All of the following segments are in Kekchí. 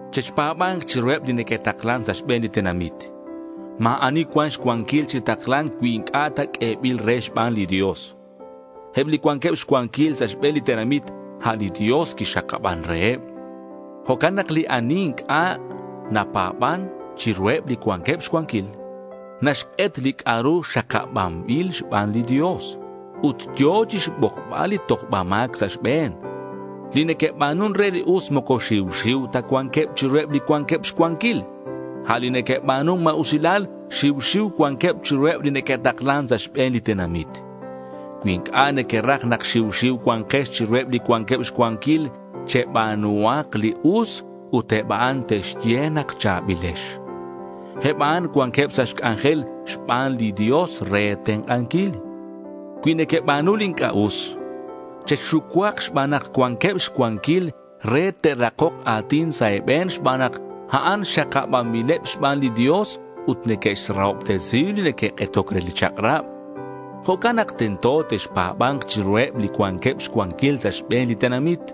Chexpa̱ba̱nk chiruheb li neque'taklan sa' xbe̱n li tenamit. Ma̱ ani cuan xcuanquil chi takla̱nc cui inc'a' ta q'uebil re xban li Dios. Eb li cuanqueb xcuanquil sa' xbe̱n li tenamit, a' li Dios quixakaban reheb. Jo'can nak li ani inc'a' napa̱ban chiruheb li cuanqueb xcuanquil, naxk'et li c'a'ru xakabanbil xban li Dios. Ut yo̱ chixbokbal li tojba ma̱c sa' xbe̱n. Li neque'ba̱nun re li us moco xiu xiu ta cuanqueb chiruheb li cuanqueb xcuanquil. A' li neque'ba̱nun ma̱usilal xiu xiu cuanqueb chiruheb li neque'taklan sa' xbe̱n li tenamit. Cui inc'a' nequeraj nak xiu xiu cua̱nkex chiruheb li cuanqueb xcuanquil, cheba̱nuhak li us, ut eb a'an te'xye nak cha̱bilex. Eb a'an cuanqueb sa' xc'anjel xban li Dios re e̱tenk'anquil. Cui nequeba̱nu li inc'a' us, chexxucuak xban nak cuanqueb xcuanquil re te'rakok a̱tin sa' e̱be̱n xban nak a'an xakabanbileb xban li Dios ut neque'xrahobtesi li neque'k'etoc re li chak'rab. Jo'can nak tento texpa̱ba̱nk chiruheb li cuanqueb xcuanquil sa' xbe̱n li tenamit.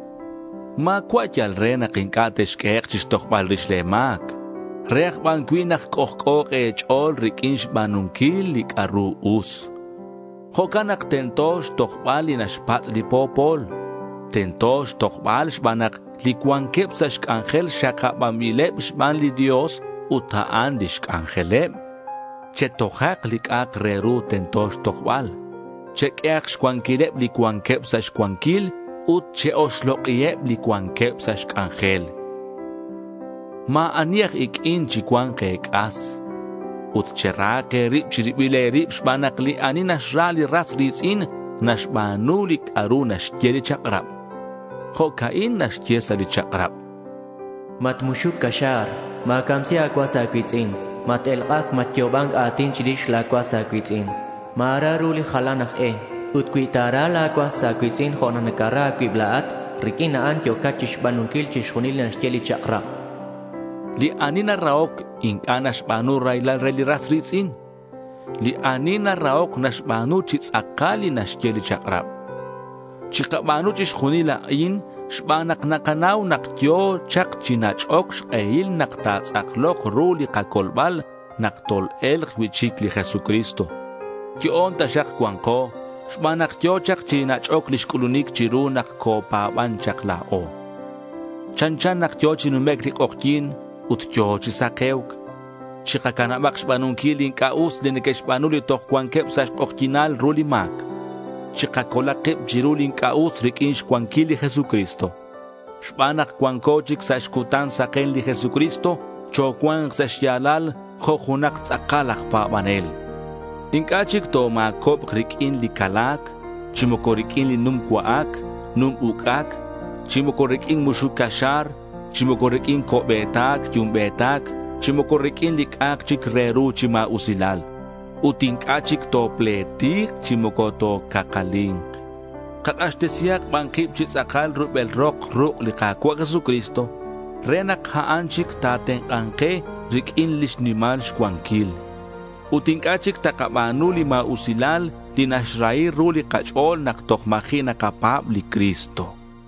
Ma̱cua' yal re nak inc'a' texq'uehek' chixtojbal rix le̱ ma̱c; re aj ban cui' nak c'ojc'o̱k e̱ch'o̱l riq'uin xba̱nunquil li c'a'ru us. Jo'can nak tento xtojbal li naxpatz' li po̱pol. Tento xtojbal xban nak li cuanqueb sa' xc'anjel xakabanbileb xban li Dios, ut a'an lix c'anjeleb. Chetojak li c'a'ak re ru tento xtojbal. Cheq'uehak xcuanquileb li cuanqueb sa' xcuanquil ut che-oxlok'iheb li cuanqueb sa' xc'anjel. Ma̱ ani aj iq'uin chicua̱nk e̱c'as. Ut cherahak e̱rib chi ribil e̱rib xban nak li ani naxra li ras ri̱tz'in naxba̱nu li c'a'ru naxye li chak'rab. Jo'ca'in naxye sa' li chak'rab: Matmuxuc caxa̱r; ma̱camsi a̱cuas a̱cui̱tz'in; mat-elk'ac, matyo'oban a̱tin chirix la̱ cuas a̱cui̱tz'in; ma̱rahi ru li jalan aj e. Ut cui ta̱ra la̱ cuas a̱cui̱tz'in jo' nak nacara a̱cuib la̱at, riq'uin a'an yo̱cat chixba̱nunquil chixjunil li naxye li chak'rab. Li ani narahoc inc'a' naxba̱nu raylal re li ras ri̱tz'in. Li narahoc naxba̱nu chi tz'akal li naxye li chak'rab. Chikaba̱nu chixjunil a'in xban nak nakanau nak yo̱ chak chi nach'oc xk'ehil nak ta̱tz'aklok ru li kacolbal nak tol-e̱lk cui'chic li Jesucristo. Yo'on taxak cua̱nko xban nak yo̱ chak chi nach'oc lix c'ulunic chiru nak copa̱ban chak la̱o. Chanchan nak yo̱ chi numec' li k'ojyi̱n ut yo̱ chi sake̱uc. Chikacanabak xba̱nunquil li inc'a' us li neque'xba̱nu li toj cuanqueb sa' xk'ojyi̱nal ru li ma̱c. Chikacolak kib chiru li inc'a' us riq'uin xcuanquil li Jesucristo. Xban nak cuanco chic sa' xcutan saken li Jesucristo, chocua̱nk sa' xya̱lal jo' junak tz'akal aj pa̱banel. Inc'a' chic toma̱cobk riq'uin li cala̱c, chi moco riq'uin li num cua'ac num uc'ac, chi moco riq'uin muxuc caxa̱r, chi moco riq'uin co'be̱tac yumbe̱tac, chi moco riq'uin li c'a'ak chic re ru chi ma̱usilalil. Ut inc'a' chic topletik chi moco tocakcali̱nk. Kak'axtesihak ban kib chi tz'akal rubel rok ruk' li Ka̱cua' Jesucristo re nak a'an chic ta̱tenk'a̱nk ke riq'uin lix nimal xcuanquil. Ut inc'a' chic takaba̱nu li ma̱usilal li naxrahi ru li kach'o̱l nak toj ma̱ji' nakapa̱b li Cristo.